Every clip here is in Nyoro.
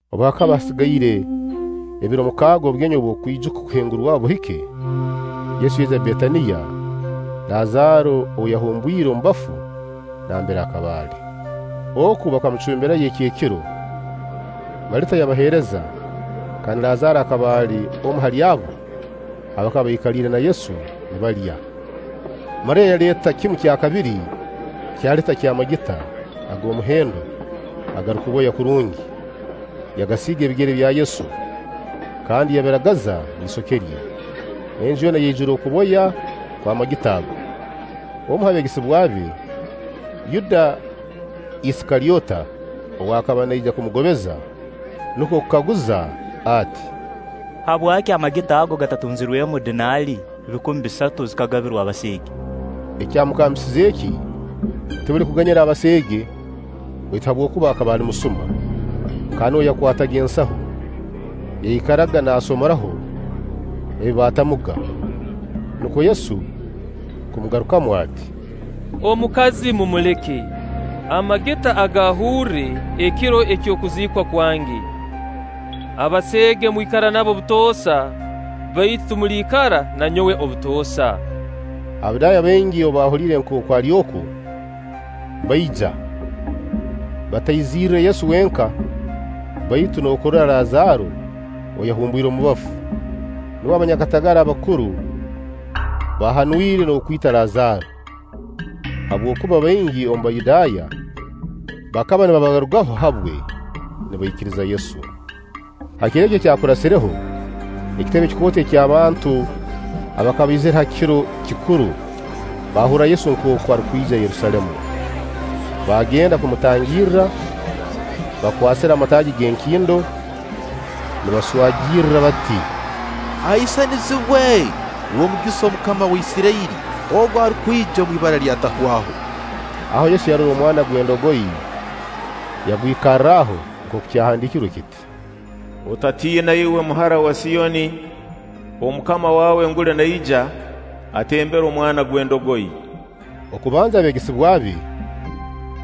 Obu hakaba hasigaire ebiro mukaaga obugenyi obw'okwijuka Okuhingurwaho buhike, Yesu yaija Betaniya, Lazaaro ou yahumbwire omu bafu nambere akaba ali. Oku bakamucumbirayo ekyekiro. Malita yabaheereza kandi Lazaaro akaba ali omu hali abo abakaba baikaliire na Yesu nibalya. Mariya yaleeta kimu kyakabiri kya lita ky'amagita ag'omuhendo agarukuboya kurungi, yagasiiga ebigere bya Yesu kandi yabiragaza n'isoke rye. Enju yoona yaijura okuboya kw'amagita ago. Omu ha beegesebwa be, Yuda Isikalyota ow'akaba naija kumugobeza, nukwo kukaguza ati: “Habwaki amagita ago gatatunzirwemu dinaali, bikumi bisatu, zikagabirwa abaseege?” Ekyamugambisize eki, tikuli kuganyira abaseege, baitu habwokuba akaba ali musuma, kandi nuwe yakwataga ensahu, yaikaraga naasomoraho ebi baatamuga. Nukwo Yesu kumugarukamu ati: “Omukazi mumuleke, amagita agaahurre ekiro eky'okuziikwa kwange. Abaseege mwikara nabo butoosa, baitu timuliikara na nyowe obutoosa.” Abayudaaya baingi obu baahuliire nkooku ali oku, baija. Bataizirre Yesu wenka, baitu n'okurora Lazaaro ou yahumbwire omu bafu. Nubwo abanyakatagara abakuru baahanwire n'okwita Lazaaro, habwokuba baingi omu Bayudaaya bakaba nibabarugaho habwe, nibaikiriza Yesu. Ha kiro ekyakurasireho, ekitebe kikooto eky'abantu abakaba baizire ha kiro kikuru bakahurra Yesu nkooku arukwija Yerusaalemu. Baagenda kumutangirra bakwasire amataagi g'emikindo, nibaswagirra bati: “Ahaisanizibwe! W'omugisa Omukama wa Isirairi, ogu arukwija omwibara ly'Atahwaho.” Aho Yesu yarora omwana gw'endogoyi, yagwikarraho nkooku kyahandiikirwe kiti: “Otatiina iwe muhara wa Siyoni. Omukama wawe nguli naija, atembere omwana gw'endogoyi!” Okubanza abeegesebwa be,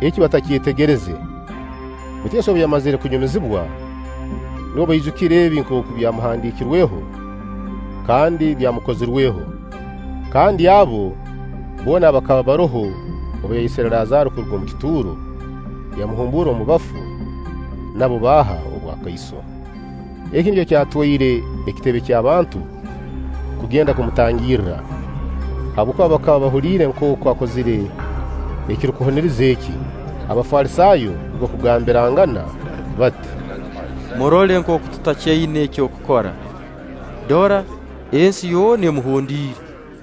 eki batakyetegereze; baitu Yesu obu yamazire kunyumizibwa, nubwo baijukire ebi nkooku byamuhandiikirweho kandi byamukozirweho. Kandi abo boona abakaba baroho obu yayesire Lazaaro kuruga omu kituuro, yamuhumbuura omu bafu, nabo baaha obwakaiso. Eki nikyo kyatwaire ekitebe ky'abantu kugenda kumutangirra, habwokuba bakaba bahuliire nkooku akozire ekirukuhuniriza eki. Abafalisaayo nukwo kugambirangana bati: “Murole nkooku tutakyaina eky'okukora; dora, ensi yoona emuhondiire.”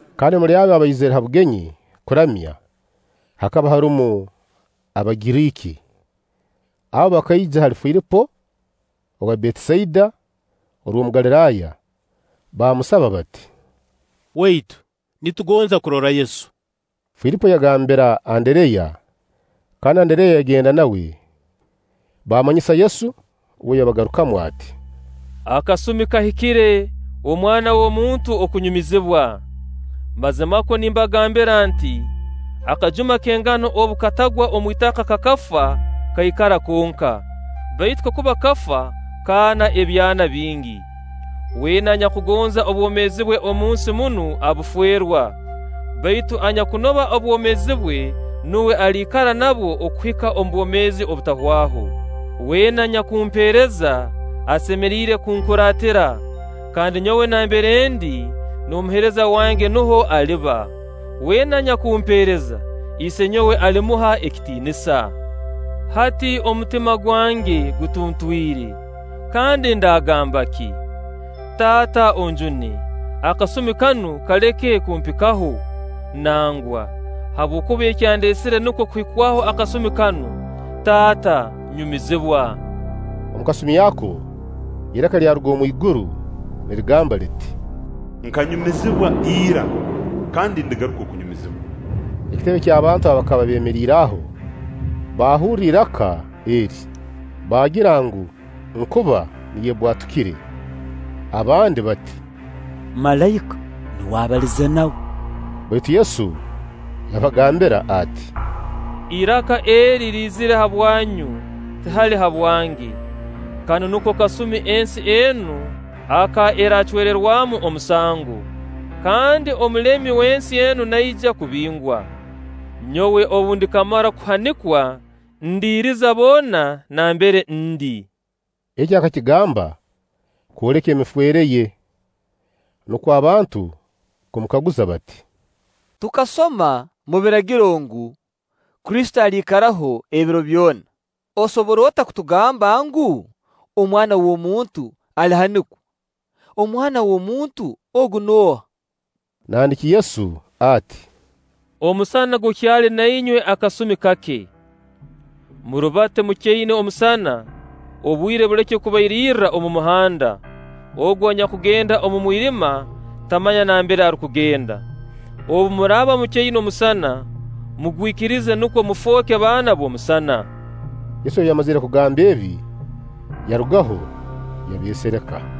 Kandi omuli abo abaizire ha bugenyi kuramya, hakaba harumu Abagiriiki. Abo bakaija hali Filipo owa Betisaida orw'omu Galiraaya, baamusaba bati: “Waitu, nitugonza kurora Yesu.” Filipo yagambira Andereya; kandi Andereya yagenda nawe, bamanyise Yesu. Uwe yabagarukamu ati: “Akasumi kahikire Omwana w'omuntu okunyumizibwa. Mazimakwo nimbagambira nti: akajuma k'engano obu katagwa omu itaka kakafa, kaikara konka; baitu kakuba kafa, kaana ebyana bingi. Weena anyakugonza obwomeezi bwe omunsi munu abuferwa, baitu anyakunoba obwomeezi bwe nuwe aliikara nabwo okuhika omu bwomeezi obutahwaho. Weena anyakumpeereza asemeriire kunkuraatira; kandi nyowe nambere ndi, n'omuheereza wange nuho aliba. Weena anyakumpeereza, Isenyowe alimuha ekitiinisa.” “Hati omutima gwange gutuntwire. Kandi ndaagamba ki? ‘Taata onjune, akasumi kanu kaleke kumpikaho’? Nangwa, habwokuba ekyandeesire nukwo kuhikwaho akasumi kanu. Taata, nyumizibwa.” Omu kasumi ako iraka lyaruga omwiguru nirigamba liti: “Nkanyumizibwa ira kandi ndigaruka okunyumizibwa.” Ekitebe ky'abantu abakaba beemeriire aho baahurra iraka eri, baagira ngu nkuba niyo ebbwatukire. Abandi bati: “Malaika nuwe abalize nawe.” Baitu Yesu yabagambira ati: “Iraka eri liizire habwanyu, tihali habwange. Kanu nuko kasumi ensi enu aka eraacwererwamu omusango, kandi omulemi w'ensi enu naija kubingwa. Nyowe obu ndikamara kuhanikwa, ndiiriza boona nambere ndi.” Eki akakigamba kwoleka emifeere ye. Nukwo abantu kumukaguza bati: “Tukasoma omu Biragiro ngu, Kristo aliikaraho ebiro byona. Osobora ota kugamba ngu, Omwana w'omuntu alihanikwa? Omwana w'omuntu ogu nooha?” Nandiki Yesu ati: “Omusana gukyali na inywe akasumi kake. Murubate mukyaina omusana, obwire buleke kubairirra omu muhanda; ogu anyakugenda omu mwirima, tamanya nambere arukugenda. Obu muraaba mukyaina omusana, mugwikirize nukwo mufooke baana b'omusana.” Yesu obu yamazire kugamba ebi, yarugaho, yabeesereka.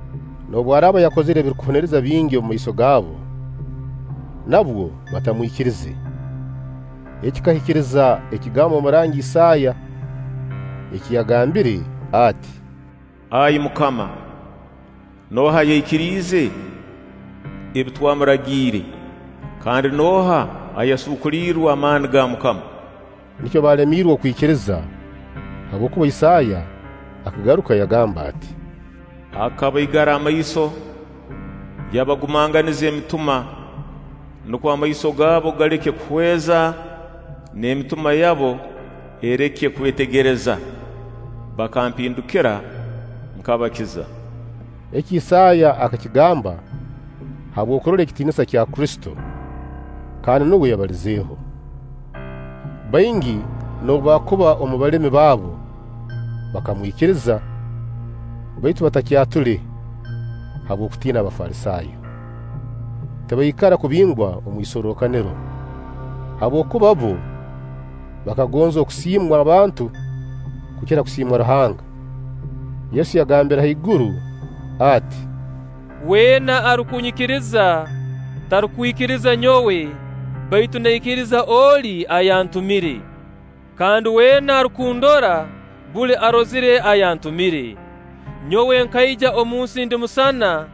Noobu araaba yakozire ebihuniriza bingi omumaiso gaabo, nabwo batamwikirize. Eki kikahikiriza ekigambo omurangi Isaaya eki yagambire ati: “Ai MUKAMA, nooha ayaikiriize ebi twamurangiire, kandi nooha ayasuukulirwe amaani ga MUKAMA?” Nikyo balemiirwe okwikiriza, habwokuba Isaaya akagaruka yagamba ati: “Akabaigara amaiso, yabagumanganiza emitima, nukwo amaiso gaabo galeke kuhweza n'emitima yabo ereke kwetegereza, bakampindukira, nkabakiza.” Eki Isaaya akakigamba habw'okurora ekitiinisa kya Kristo, kandi nuwe yabalizeho. Baingi, noobu baakuba omu balemi babo, bakamwikiriza; baitu batakyatule habw'okutiina Abafalisaayo, tibaikara kubingwa omu isorrokaniro; habwokuba bbo bakagonza okusiimwa abantu kukira kusiimwa Ruhanga. Yesu yagambira haiguru ati: “Weena arukunyikiriza, tarukwikiriza nyowe, baitu naikiriza Oli ayantumire. Kandi weena arukundora, buli arozire ayantumire. Nyowe nkaija omunsi ndi musana,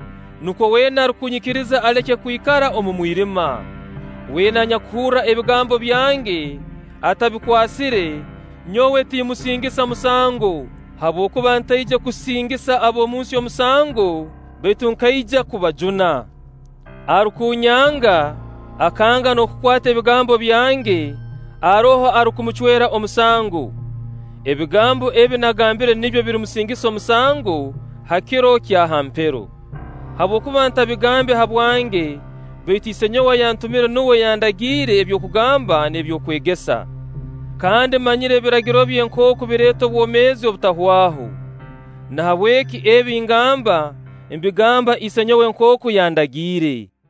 nukwo weena arukunyikiriza aleke kwikara omu mwirima. Weena anyakuhurra ebigambo byange atabikwasire, nyowe timmusingisa musango. Habwokuba ntaije kusingisa ab'omunsi omusango, baitu nkaija kubajuna. Arukunyanga, akanga n'okukwata ebigambo byange, haroho arukumucwera omusango. Ebigambo ebi nagambire nibyo birimusingisa omusango ha kiro kya ha mpero. Habwokuba ntabigambe habwange, baitu Isenyowe ayantumire nuwe yandagiire eby'okugamba n'eby'okwegesa. Kandi mmanyire Ebiragiro bye nkooku bireeta obwomeezi obutahwaho. Nahabweki ebi ngamba, mbigamba isenyowe nkooku yadagiire.”